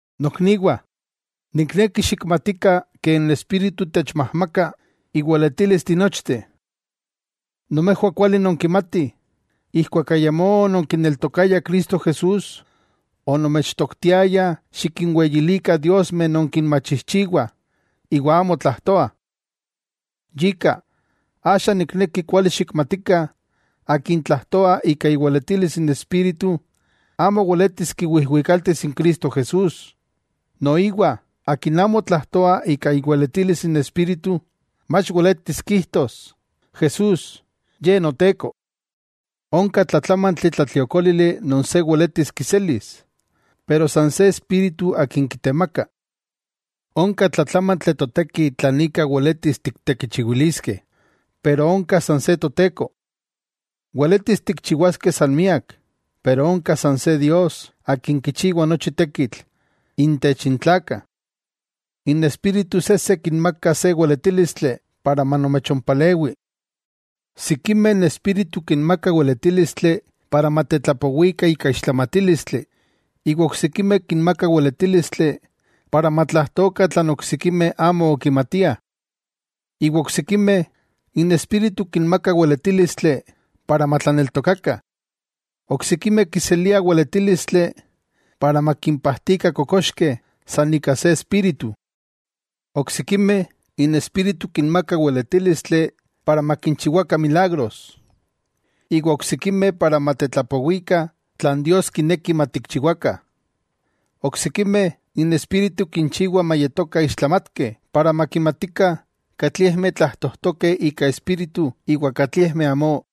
Nokniwah, nikneki xikmatikah ke n Espíritu techmajmaka iweletilis tinochteh. Nomejwah kuali nonkimatih, ijkuak ayamó ononkineltokayah Cristo Jesús, onomechtoktiayah xikinweyilikah diosmeh non kinmachijchiwah iwa amo tlajtoah. Yika, axa nikneki kuali xikmatikah akin tlajtoa ika iweletilis n Espíritu amo weletis kiwijwikaltis n Cristo Jesús. Noiwa akin amo tlajtoa ika iweletilis n Espíritu, mach weletis kijtos, “¡Jesús, Ye Noteko!” Onka tlatlámantli tlatliokólili non se weletis kiselis, pero san se Espíritu akin kitemaka. Onka tlatlámantli toteki tlan ika weletis tiktekichiwiliskeh, pero onka san se Toteko. Weletis tikchiwaskeh san miak, pero onka san se Dios akin kichiwa nochi tekitl intech n tlakah. N Espíritu sejse kinmaka se weletílistli para manomechompalewi. Sikimeh n Espíritu kinmaka weletílistli para matetlapowikah ika ixtlamatílistli. Iwa oksikimeh kinmaka weletílistli para matlajtokah tlan oksikimeh amo okimatiah. Iwa oksikimeh, n Espíritu kinmaka weletílistli para matlaneltokakah. Oksikimeh kiseliah weletílistli para makimpajtikah kokoxkeh san ika se Espíritu. Oksikimeh, n Espíritu kinmaka weletílistli para makinchiwakah milagros, iwa oksikimeh para matetlapowikah tlan Dios kineki matikchiwakah. Oksikimeh, n Espíritu kinchiwa mayetokah ixtlamatkeh para makimatikah katliejmeh tlajtojtokeh ika Espíritu iwa katliejmeh amó.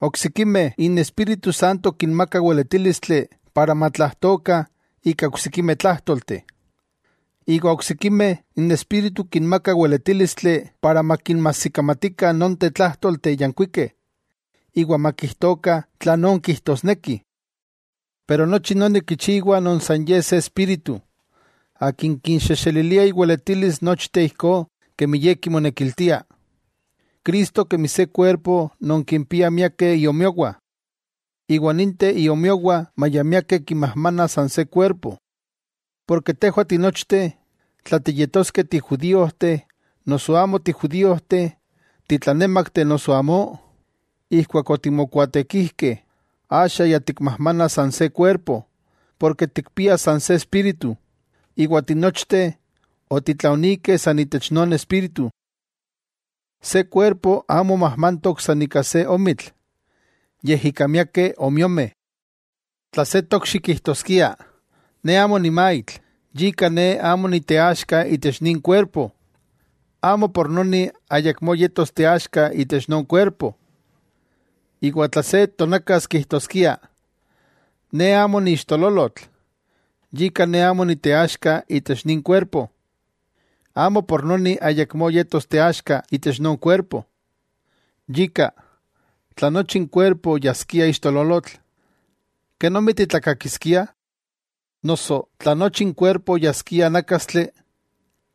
Oksikimeh, n Espíritu Santo kinmaka weletílistli para matlajtokah ika oksikimeh tlájtolteh. Iwa oksikimeh, n Espíritu kinmaka weletílistli para makinmajsikamatikah nonteh tlájtolteh yankuikeh iwa makijtokah tlanón kijtosnekih. Pero nochi noni kichiwa non san Ye se Espíritu, Akin kinxejxelilia iweletilis nochteh ijkó kemi Ye kimonekiltia. Cristo kemi se kuerpo non kimpia miakeh iomiowah, iwa ninteh iomiowah maya miakeh kimajmana san se kuerpo. Porke tejwah tinochteh, tla tiyetoskeh tijudíojteh noso amo tijudíojteh, titlanémakteh noso amó, ijkuak otimokuaatekijkeh, axa ya tikmajmana san se kuerpo porke tikpiah san se Espíritu, iwa tinochteh otitlaonikeh san itech non Espíritu. Se kuerpo amo majmantok san ika se omitl, yej ika miakeh omiomeh. Tla se tokxi kijtoskia: “Ne amo nimaitl, yika ne amo niteaxka itech nin kuerpo”, amo por noni ayakmó yetos teaxka itech non kuerpo. Iwa tla se tonakas kijtoskia: “Ne amo niixtololotl, yika ne amo niteaxka itech nin kuerpo”, amo por noni ayakmó yetos teaxka itech non kuerpo. Yika, tla nochi n kuerpo yaskia ixtololotl, ¿kenomi titlakakiskiah? Noso tla nochi n kuerpo yaskia nákastli,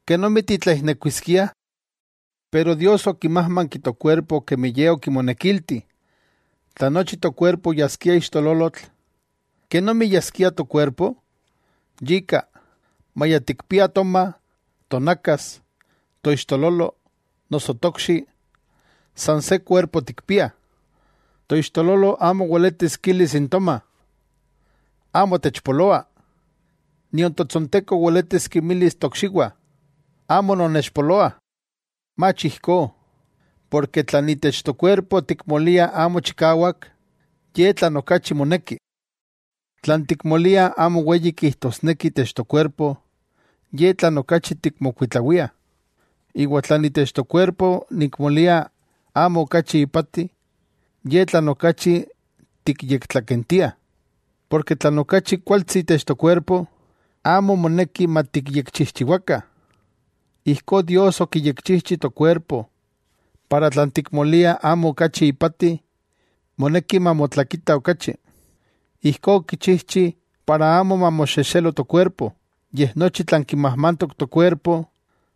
¿kenomi titlaijnekuiskiah? Pero Dios okimájmanki tokuerpo kemi Ye okimonekilti. Tla nochi tokuerpo yaskia ixtololotl, ¿kenomi yaskia tokuerpo? Yika, maya tikpiah toma, tonakas, toixtololo noso tokxi, san se kuerpo tikpiah. Toixtololo amo weletis kilis n toma: “Amo techpoloa”; nion totsonteko weletis kinmilis tokxiwah: “Amo nonnechpoloah.” Mach ijkó, porke tlan itech tokuerpo tikmoliah amo chikawak, ye tlan okachi moneki. Tlan tikmoliah amo weyi kijtosneki itech tokuerpo, ye tlan okachi tikmokuitlawiah. Iwa tlan itech tokuerpo nikmolia amo okachi ipati, ye tlan okachi tikyektlakentia. Porke tlan okachi kualtsi itech tokuerpo, amo moneki matikyekchijchiwakah. Ijkó Dios okiyekchijchi tokuerpo para tlan tikmoliah amo okachi ipati, moneki mamotlakita okachi. Ijkó okichijchi para amo mamoxexelo tokuerpo, yej nochi tlan kimajmantok tokuerpo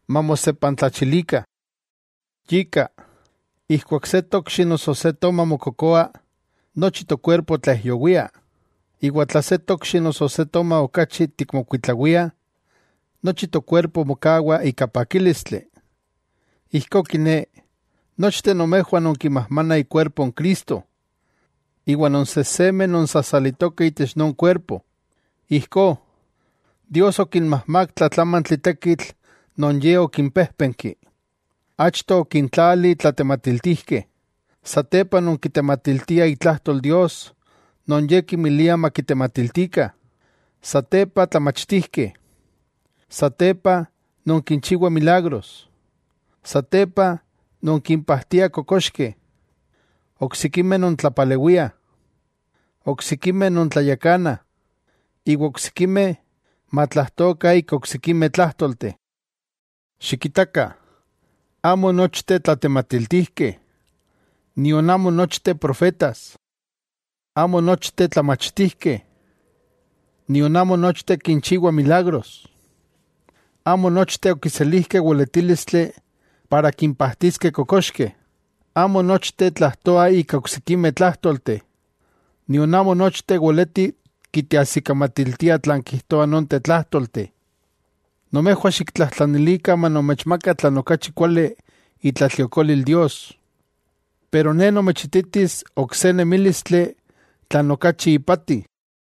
mamosepantlachilikah. Yika, ijkuak se tokxi noso se toma mokokoa, nochi tokuerpo tlaijyowia. Iwa tla se tokxi noso se toma okachi tikmokuitlawiah, nochi tokuerpo mokawa ika pakílistli. Ijkó kiné, nochteh nomejwah nonkimajmanah ikuerpo n Cristo, iwa non sejsemeh non sasalitokeh itech non kuerpo. Ijkó, Dios okinmajmak tlatlamantli tekitl non Ye okinpéjpenki. Achto, okintlali tlatematiltijkeh, satepa non kitematiltiah itlajtol Dios non Ye kinmilia makitematiltikah, satepa, tlamachtijkeh, satepa, non kinchiwah milagros, satepa, non kimpajtiah kokoxkeh, oksikimeh non tlapalewiah, oksikimeh non tlayakana, iwa oksikimeh matlajtokah ika oksikimeh tlájtolteh. Xikitakah, amo nochteh tlatematiltijkeh, nion amo nochteh profetas. Amo nochteh tlamachtijkeh, nion amo nochteh kinchiwah milagros. Amo nochteh okiselijkeh weletílistli para kimpajtiskeh kokoxkeh, amo nochteh tlajtoah ika oksikimeh tlájtolteh, nion amo nochteh weletih kiteajsikamatiltiah tlan kijtoah nonteh tlájtolteh. Nomejwah xiktlajtlanilikah manomechmaka tlan okachi kuali itlatliokolil Dios. Pero ne nomechititis ok se nemílistli tlan okachi ipati.